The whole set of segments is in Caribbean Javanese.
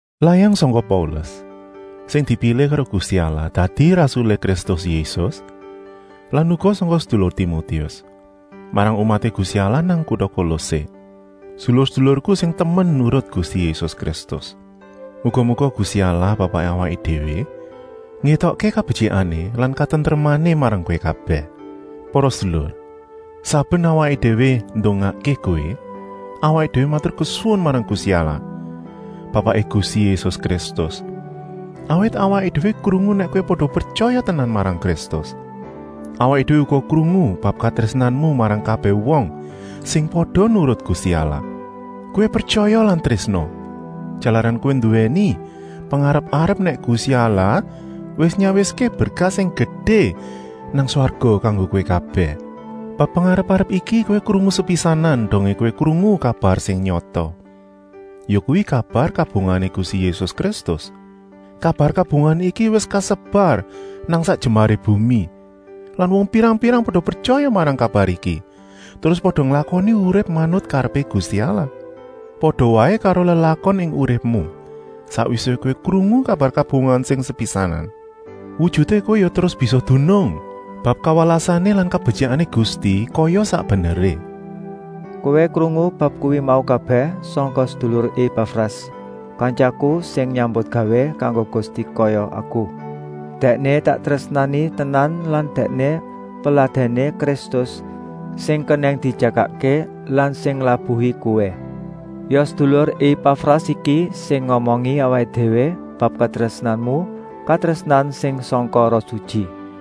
Layang sangka Paulus, sing dipilih karo Gusti Allah dadi rasulé Kristus Yésus lan uga sangka sedulur Timotius, marang umaté Gusti Allah nang kuta Kolosé, sedulur-sedulurku sing temen nurut Gusti Yésus Kristus. Muga-muga Gusti Allah Bapaké awaké déwé ngétokké kabetyikané lan katentremané marang kowé kabèh! Para sedulur, saben awaké déwé ndongakké kowé, awaké déwé maturkesuwun marang Gusti Allah Bapaké Gusti Yésus Kristus, awit awaké déwé krungu nèk kowé pada pretyaya tenan marang Kristus. Awaké déwé uga krungu bab katrésnanmu marang kabèh wong sing pada nurut Gusti Allah. Kowé pretyaya lan trésna, jalaran kowé nduwèni pengarep-arep nèk Gusti Allah wis nyawiské berkah sing gedé nang swarga kanggo kowé kabèh. Bab pengarep-arep iki kowé krungu sepisanan dongé kowé krungu kabar sing nyata, yakuwi kabar kabungahané Gusti Yésus Kristus. Kabar kabungahan iki wis kasebar nang sak jembaré bumi lan wong pirang-pirang pada pretyaya marang kabar iki terus pada nglakoni urip manut karepé Gusti Allah. Pada waé karo lelakon ing uripmu, sakwisé kowé krungu kabar kabungahan sing sepisanan. Wujuté kowé ya terus bisa dunung bab kawelasané lan kabetyikané Gusti kaya sak beneré. Kowé krungu bab kuwi mau kabèh sangka sedulur Epafras, kantyaku sing nyambutgawé kanggo Gusti kaya aku. Dèkné tak trésnani tenan lan dèkné peladèné Kristus sing kenèng dijagakké lan sing nglabuhi kowé. Ya sedulur Epafras iki sing ngomongi awaké déwé bab katrésnanmu, katrésnan sing sangka Roh Sutyi.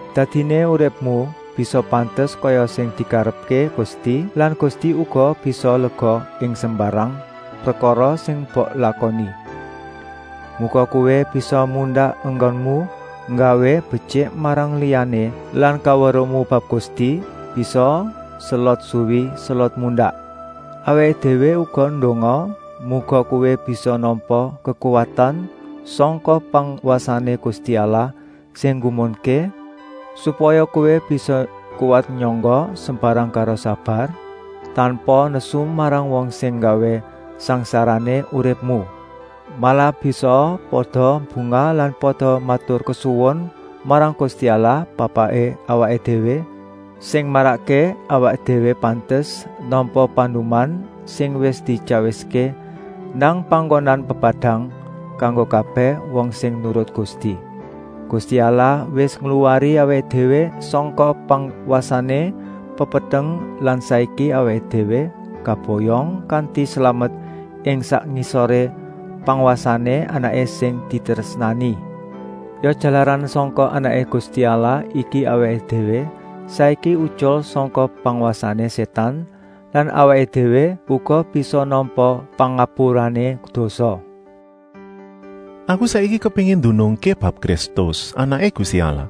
Dadiné uripmu bisa pantes kaya sing dikarepké Gusti lan Gusti uga bisa lega ing sembarang prekara sing mbok lakoni. Muga kowé bisa mundak enggonmu nggawé betyik marang liyané lan kaweruhmu bab Gusti bisaa selot suwi selot mundak. Awaké déwé uga ndonga, muga kowé bisa nampa kekuwatan sangka pangwasané Gusti Allah sing nggumunké, supaya kowé bisa kuwat nyangga sembarang karo sabar, tanpa nesu marang wong sing nggawé sangsarané uripmu. Malah bisaa pada bungah lan pada maturkesuwun marang Gusti Allah Bapaké awaké déwé, sing marakké awaké déwé pantes nampa panduman sing wis dityawiské nang panggonan pepadang, kanggo kabèh wong sing nurut Gusti. Gusti Allah wis ngluwari awaké déwé sangka pangwasané pepeteng lan saiki awaké déwé kaboyong kanti slamet ing sak ngisoré pangwasané Anaké sing ditrésnani. Ya jalaran sangka Anaké Gusti Allah iki awaké déwé saiki utyul sangka pangwasané Sétan lan awaké déwé uga bisa nampa pangapurané dosa. Aku saiki kepéngin ndunungké bab Kristus, Anaké Gusti Allah.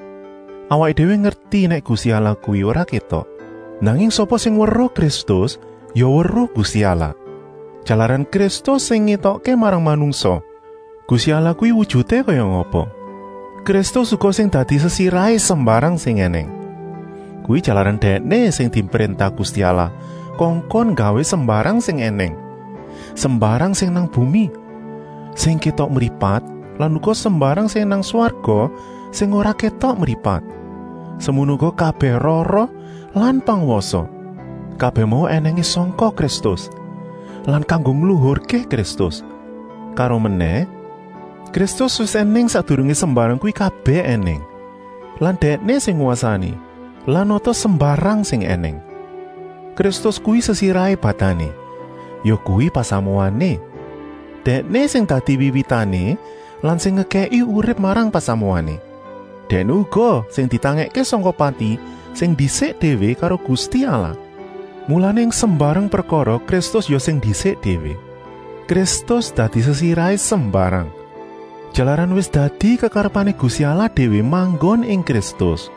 Awaké déwé ngerti nèk Gusti Allah kuwi ora kétok, nanging sapa sing weruh Kristus ya weruh Gusti Allah, jalaran Kristus sing ngétokké marang manungsa Gusti Allah kuwi wujuté kaya ngapa. Kristus uga sing dadi sesirahé sembarang sing ènèng. Kuwi jalaran Dèkné sing dipréntah Gusti Allah kongkon nggawé sembarang sing ènèng, sembarang sing nang bumi, sing kétok mripat lan uga sembarang sing nang swarga sing ora kétok mripat, semono uga kabèh roh-roh lan pangwasa. Kabèh mau ènèngé sangka Kristus lan kanggo ngluhurké Kristus. Karomenèh, Kristus wis ènèng sakdurungé sembarang kuwi kabèh ènèng lan Dèkné sing ngwasani lan nata sembarang sing ènèng. Kristus kuwi sesirahé badané, yakuwi pasamuané. Dèkné sing dadi wiwitané lan sing ngekèki urip marang pasamuané. Dèkné uga sing ditangèkké sangka pati sing ndisik déwé karo Gusti Allah, mulané ing sembarang prekara Kristus ya sing ndisik déwé. Kristus dadi sesirahé sembarang, jalaran wis dadi kekarepané Gusti Allah déwé manggon ing Kristus,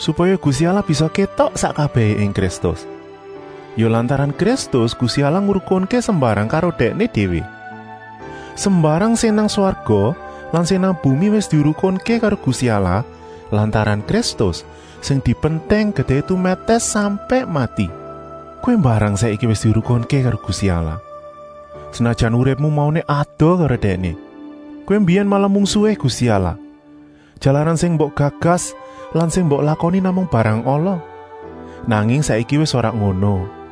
supaya Gusti Allah bisa kétok sak kabèhé ing Kristus. Ya lantaran Kristus Gusti Allah ngrukunké sembarang karo Dèkné déwé. Sembarang sing nang swarga lan sing nang bumi wis dirukunké karo Gusti Allah lantaran Kristus, sing dipentèng getihé tumètès sampèk mati. Kowé mbarang saiki wis dirukunké karo Gusti Allah, senajan uripmu mauné adoh karo Dèkné. Kowé mbiyèn malah mungsuhé Gusti Allah, jalaran sing mbok gagas lan sing mbok lakoni namung barang ala. Nanging saiki wis ora ngono.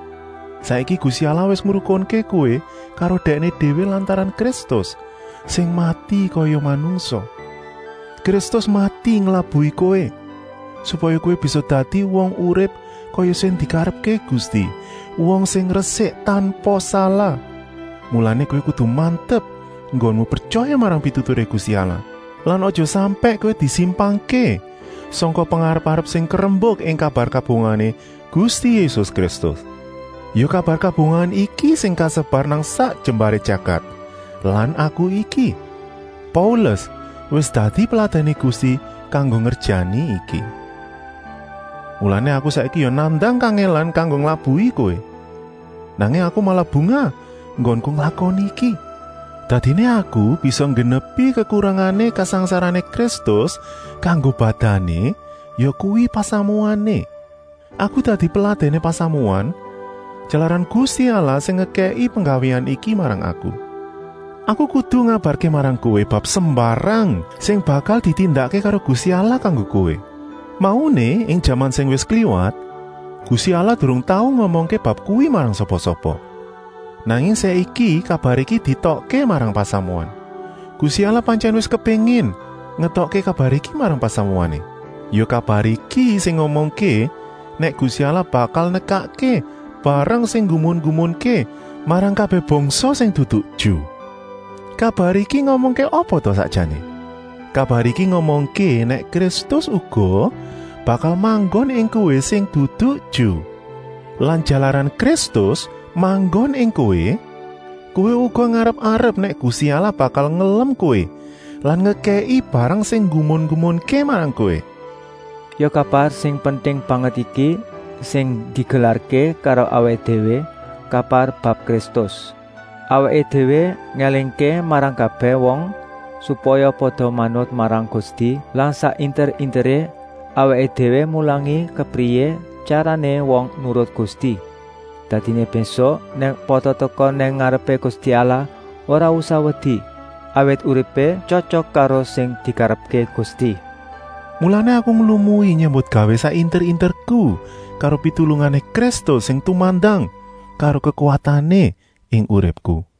Saiki Gusti Allah wis ngrukunké kowé karo Dèkné déwé lantaran Kristus, sing mati kaya manungsa. Kristus mati nglabuhi kowé, supaya kowé bisa dadi wong urip kaya sing dikarepké Gusti, wong sing resik tanpa salah. Mulané kowé kudu mantep enggonmu pretyaya marang pituturé Gusti Allah lan aja sampèk kowé disimpangké sangka pengarep-arep sing karembuk ing kabar kabungahané Gusti Yésus Kristus. Ya kabar kabungahan iki sing kasebar nang sak jembaré jagat lan aku iki, Paulus wis dadi peladèné Gusti kanggo ngerjani iki. Mulané aku saiki ya nandang kangèlan kanggo nglabuhi kowé, nanging aku malah bungah enggonku nglakoni iki. Dadiné aku bisa nggenepi kekurangané kasangsarané Kristus kanggo badané, yakuwi pasamuané. Aku dadi peladèné pasamuan, jalaran Gusti Allah sing ngekèki penggawéan iki marang aku. Aku kudu ngabarké marang kowé bab sembarang sing bakal ditindakké karo Gusti Allah kanggo kowé. Mauné, ing jaman sing wis kliwat, Gusti Allah durung tau ngomongké bab kuwi marang sapa-sapa. Nanging saiki kabar iki dietokké marang pasamuan. Gusti Allah pantyèn wis kepéngin ngetokké kabar iki marang pasamuané. Ya kabar iki sing ngomongké nèk Gusti Allah bakal nekakké barang sing nggumun-nggumunké marang kabèh bangsa sing dudu Ju. Kabar iki ngomongké apa ta sakjané? Kabar iki ngomongké nèk Kristus uga bakal manggon ing kowé sing dudu Ju. Lan jalaran Kristus manggon ing kowé, kowé uga ngarep-arep nèk Gusti Allah bakal ngelem kowé lan ngekèki barang sing nggumun-nggumunké marang kowé. Ya kabar sing penting banget iki sing digelarké karo awaké déwé, kabar bab Kristus. Awaké déwé ngélingké marang kabèh wong, supaya pada manut marang Gusti lan sak inter-interé awaké déwé mulangi kepriyé tyarané wong nurut Gusti. Dadiné mbésuk nèk pada teka nang ngarepé Gusti Allah ora usah wedi, awit uripé tyotyok karo sing dikarepké Gusti. Mulané aku nglumui nyambutgawé sak inter-interku karo pitulungané Kristus sing tumandang karo kekuwatané ing uripku.